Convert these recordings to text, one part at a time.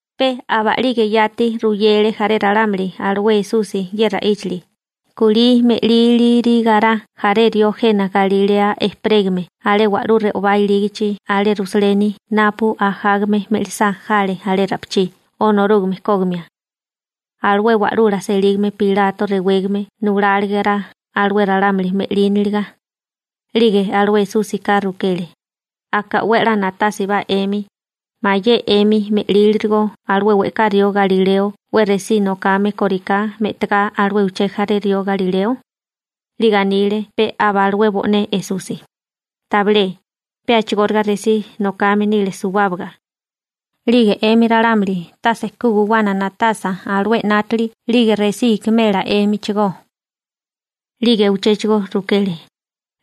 Pe aba'lige yati ruyele jaré ralámuli alué Esusi ye ra'íchali: ―Kulí me'lílirigará jaré rió jena Galilea ejperégame alé wa'lú re'obá ilígachi alé Rusaleni napu ajágame me'lisá jale alé ra'pichí Onorúgame kógimia. Alué wa'lula selígame Pilato rewégame nulálegara alué ralámuli me'líniliga. 'Lige alué Esúsika rukele: ―Aka 'we a'lá na'tásibá 'emi, ¿mayé 'emi me'lílirigo alué we'ká rió galileo 'we resí nokame kóriká me'tagá alué uché jaré rió galileo? 'Lige anile pe aba alué bo'né Esusi: ―Tabilé, pe a'chigóriga resí nokame nile suwábaga. 'Lige 'emi ralámuli tase ku guwana na'tasa alué 'nátili 'lige resí ikimela 'émichigó. 'Lige uchéchigo rukele: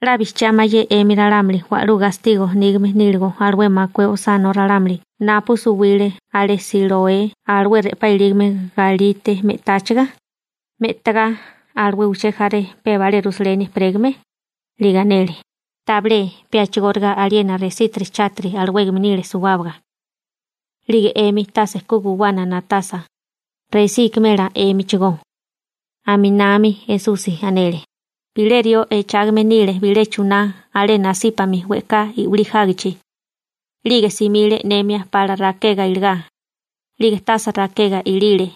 ―¿'La bijchiá mayé 'emi ralámuli wa'lú gastigo nígame níligo alué makué osánó ralámuli napu suwile alé Siloé alué re'pá ilígame galite me'táchaga, me'tagá alué uché jaré pe abalé Rusaleni ejperégame? 'Lige anele: ―Tabilé, pe a'chigóriga aliena resítiri chátiri alawégame nile suwábaga. 'Lige 'emi tase ku guwana na'tasa, resí ikimela 'émichigó. Aminami Esusi anele: ―Bilé rió echágame nile bilé chuná alé nasípami we'ká i'wilí jágichi. 'Lige simile e'nemia pala rakega iligá, 'lige tase rakega ilile.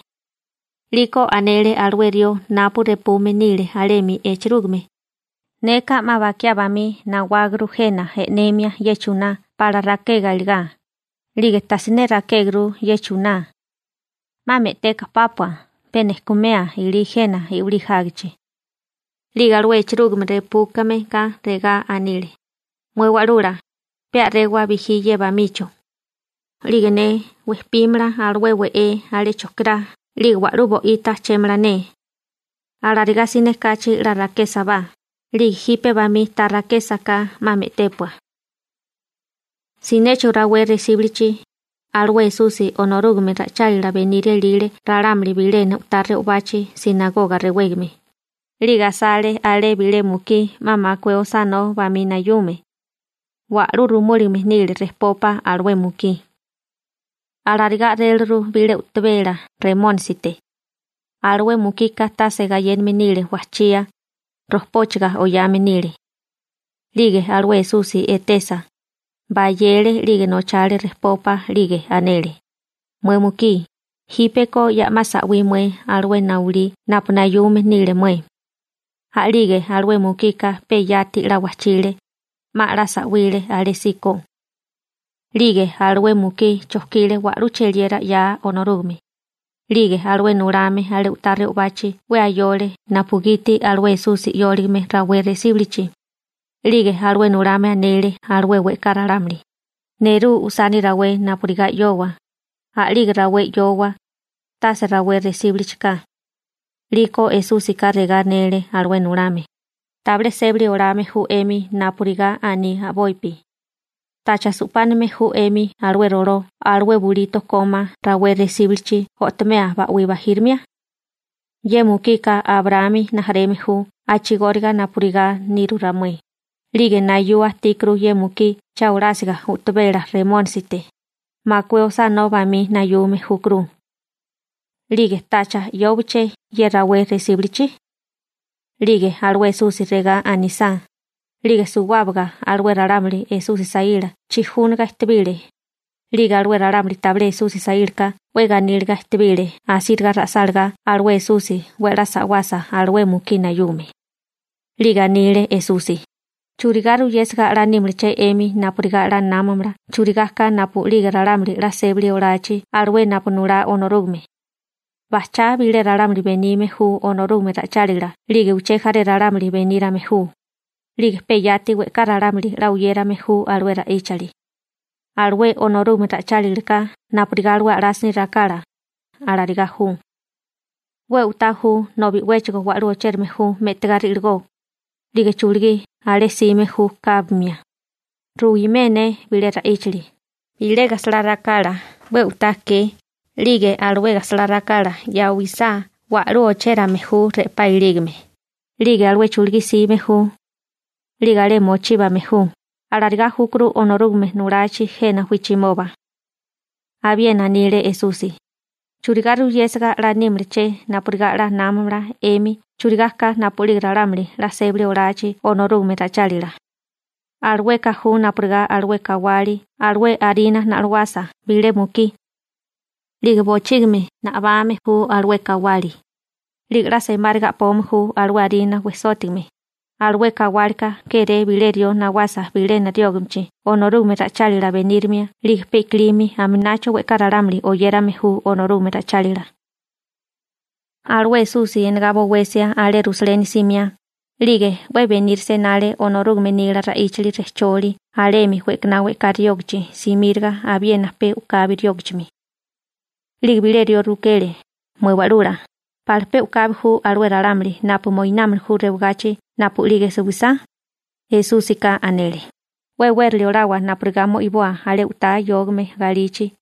'Liko anele alué rió napu repume nile alemi echerúgime: «Neka 'ma bakiá bamí nawáguru jena e'nemia ye chuná pala rakega iligá, 'lige tasiné rakéguru ye chuná. 'Ma me'teka pápua, pe nejkumea ilí jena i'wilí jágichi.» › 'Lige alué echerúgime repúmeka regá anile: «Mué wa'lula, pe a'réwa'é bijí ye bamicho. 'Lige ne we'pínamala alué we'é alé chojkirá 'lige wa'lú bo'ita ajchémala ne. Alarigá siné kachi 'la rakésabá, 'lige jipe bamí ta rakésaká 'ma me'tépua.» Sinéchigo rawé resíbulichi, alué Esusi Onorúgame ra'ichálila beniria ilile ralámuli bilena u'tá re'obachi «sinagoga» rewégame, 'lige asale alé bilé mukí 'ma makué osánó bamí nayume. Wa'lú rumúligame nile rejpopa alué mukí. Alarigá a'réliru bilé u'tabela remónisite. Alué mukika tase gayéname nile wajchía, rojpóchaga oyame nile. 'Lige alué Esusi etesa, bayele 'lige nochale rejpopa 'lige anele: ―Mué mukí, jípeko ya 'ma sa'wí mué alué nayulí napu nayume nile mué. A'lige alué mukika pe yati 'la wajchile, 'ma 'la sa'wile alésíko. 'Lige alué mukí chojkile wa'lú cheliera 'yaa Onorúgame. 'Lige alué nulame alé u'tá re'obachi 'we ayole napugiti alué Esusi 'yóligame rawé resíbulichi. 'Lige alué nulame anele alué we'ká ralámuli: ―Nerú usani rawé napurigá 'yoboa, a'lige rawé 'yoboa, tase rawé resíbulichi ka. 'Liko Esúsika regá anele alué nulame: ―¡Tabilé sébali olame ju 'emi napurigá aní a'bopi! ¿Tacha su'páname ju 'emi alué roló alué bulito kómá rawé resíbulichi o'tomea ba'wí bajírimia? Ye mukika Abraámi rijimala ju a'chigóriga napurigá niru ramué, 'lige nayua ajtíkuru ye mukí cha olásiga u'tabela remónisite, makué osánó bamí nayume júkuru. ¿'Lige tacha 'yówaché ye rawé resíbulichi? 'Lige alué Esusi regá anisá, 'lige suwábaga alué ralámuli Esusi saíla chijúniga ejtebile, 'lige alué ralámuli tabilé Esusi saílaka 'we ganíliga ejtebile asíriga ra'sálagá alué Esusi 'we a'lá sa'wasa alué mukí nayume. 'Lige anile Esusi: ―¿Churigá ruyésiga 'la nímalaché 'emi napurigá 'la námamala churigá ka napu'lige ralámuli 'la sébali olachi alué napu nulá Onorúgame? Bajchá bilé ralámuli benime ju Onorúgame ra'ichálila 'lige uché jaré ralámuli benírame ju, 'lige pe yati we'ká ralámuli 'la oyérame ju alué ra'íchali. Alué Onorúgame ra'ichálilaka napurigá alué a'lásini rakala, alarigá ju. 'We u'tá ju nobi 'wéchigo wa'lú ochérame ju me'tigá ri'ligó, 'lige chulugí alé jsime ju kábimia. › Ruwimé ne bilé ra'íchali: Bilé gajsalá rakala 'we u'tá ke 'lige alué gajsalá rakala ya'wisá wa'lú ochérame ju re'pá ilígame, 'lige alué chulugí jsime ju 'lige alé mochíbame ju. Alarigá júkuru Onorúgame nulachi jena wijchimoba. Abiena anile Esusi: ―¿Churigá ruyésiga 'la nímalaché napurigá 'la námamala 'emi churigá ka napu'lige ralámuli 'la sébali olachi Onorúgame ra'ichálila? Alueka ju napurigá alué kawali (lebarura) alué arina na'loasa bilé mukí. 'Lige bochígimi nabame ju alué kawali, 'lige 'la semáriga a'pome ju alué arina wejsótigame. Alué kawálika káréke'é bilé rió nawasa bilena riógichimi Onorúgame ra'ichálila benírimia 'lige pe i'kilimi aminacho we'ká ralámuli oyérame ju Onorúgame ra'ichálila. Alué Esusi enegá bowesia alé Rusaleni simiá, 'lige 'we benírisia enale Onorúgame nila ra'íchali rejcholi alemi we'kaná we'ká riógachi simíraga abiena pe u'kabi riógachimi. 'Lige bilé rió rukele: ―Mué Wa'lula, ¿pala pe u'kabi ju alué ralámuli napu moinámili ju rewagachi napu'lige suwisá? Esúsika anele: ―'We e'wérali olawa napurigá mo'iboa alé u'tá yógame galichi.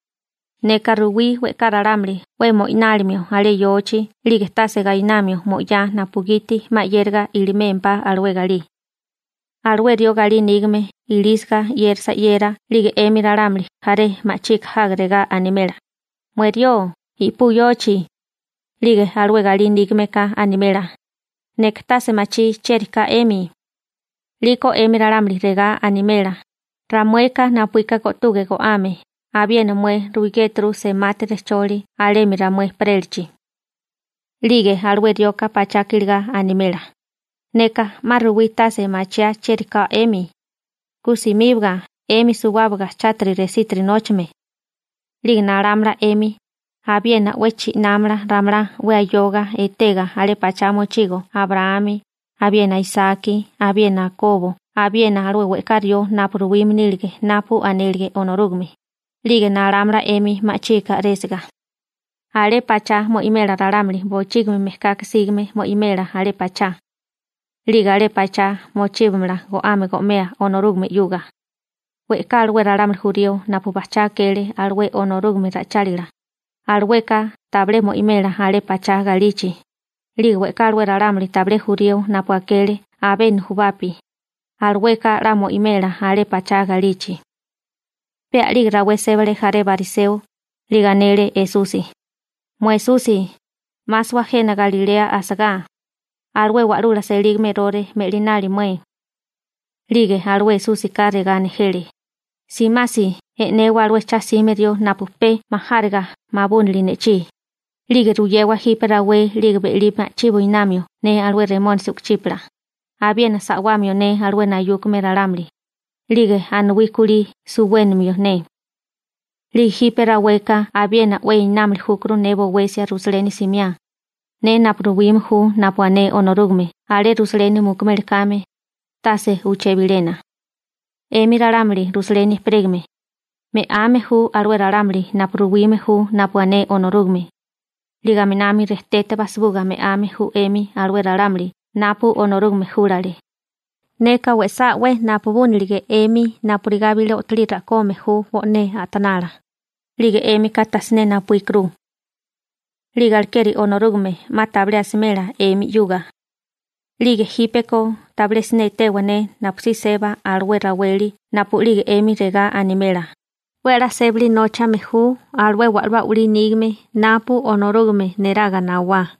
Neka ruwí we'ká ralámuli 'we mo'inálimio alé yochi 'lige tase gainamio mo'yá napugiti 'ma 'yériga ilimémpá alué galí. Alué rió galí nígame ilísiga 'yérisa 'yera 'lige 'emi ralámuli jaré ma'chika jaga regá animela: «Mué rió, i'pú yochi.» 'Lige alué galí nígameka animela: «Neka tase machí chieri ka 'emi.» › 'Liko 'emi ralámuli regá animela: «Ramueka napuíka go'tuge go'ame, abiena mué ruigéturu semati rejcholi alemi ramué ejperélachi.» › 'Lige alué rioka pachaka iligá animela: «Neka 'ma ruwí tase machiá chieri ka 'emi. ¡Ku simíbaga 'emi suwábaga chátiri resítiri nóchame!» › 'Lige nalámala 'emi, abiena 'we chi'námala ramalá 'we ayoga etega alé pachá mochigo Abraámi, abiena Isaki abiena Akobo abiena alué we'ká rió napu ruwime nílige napu anélige Onorúgame, 'lige nalámala 'emi ma'chika a'résiga. Alé pachá mo'imela ralámuli, bochígimi mejkaka sígame mo'imela alé pachá. 'Lige alé pachá mochíbamala go'ame go'mea Onorúgame 'yuga. We'ká alué ralámuli jurío napu bajchá akele alué Onorúgame ra'ichálila, alueka tabilé mo'imela alé pachá galichi. 'Lige we'ká alué ralámuli tabilé jurío napu akele abé nujubapi, alueka 'la mo'imela alé pachá galichi. Pe a'lige rawé sébale jaré bariseo, 'lige anele Esusi: ―Mué Esusi, 'másawa jena Galilea asagá, alué wa'lula selígame Erore me'linali mué. 'Lige alué Esúsika regá nejele: ―Simasi e'newa alué cha'sime rió napu pe majáriga mabúnili ne'chí, 'lige ruyewa jipe rawé 'lige be'lí ma'chí buinamio ne alué remónisi u'kuchípala, abiena sa'wamio ne alué nayúkame ralámuli, 'lige anuwí kulí suwénamio ne. 'Lige jipe raweka abiena 'we enámili júkuru ne bowesia Rusaleni simiá, ne napu ruwime ju napu ané Onorúgame alé Rusaleni mukumeli kame, tase uché bilena. › ¡'Emi ralámuli Rusaleni ejperégame, me'ame ju alué ralámuli napu ruwime ju napu ané Onorúgame, 'lige aminami rejtete bajsibuga me'ame ju 'emi alué ralámuli napu Onorúgame júlale! Neka we'sá 'we napubúnilige 'emi napurigá bilé o'tolí ra'kome ju bo'né a'tanala, 'lige 'émika tasiné napuíkuru. 'Lige alekeri Onorúgame 'ma tabilé asimela 'emi 'yuga. 'Lige jípeko tabilé siné etewa ne napusí seba alué raweli napu'lige 'emi regá animela: «'We a'lá sébali nóchame ju alué wa'lú a'walí nígame napu Onorúgame neraga nawá.»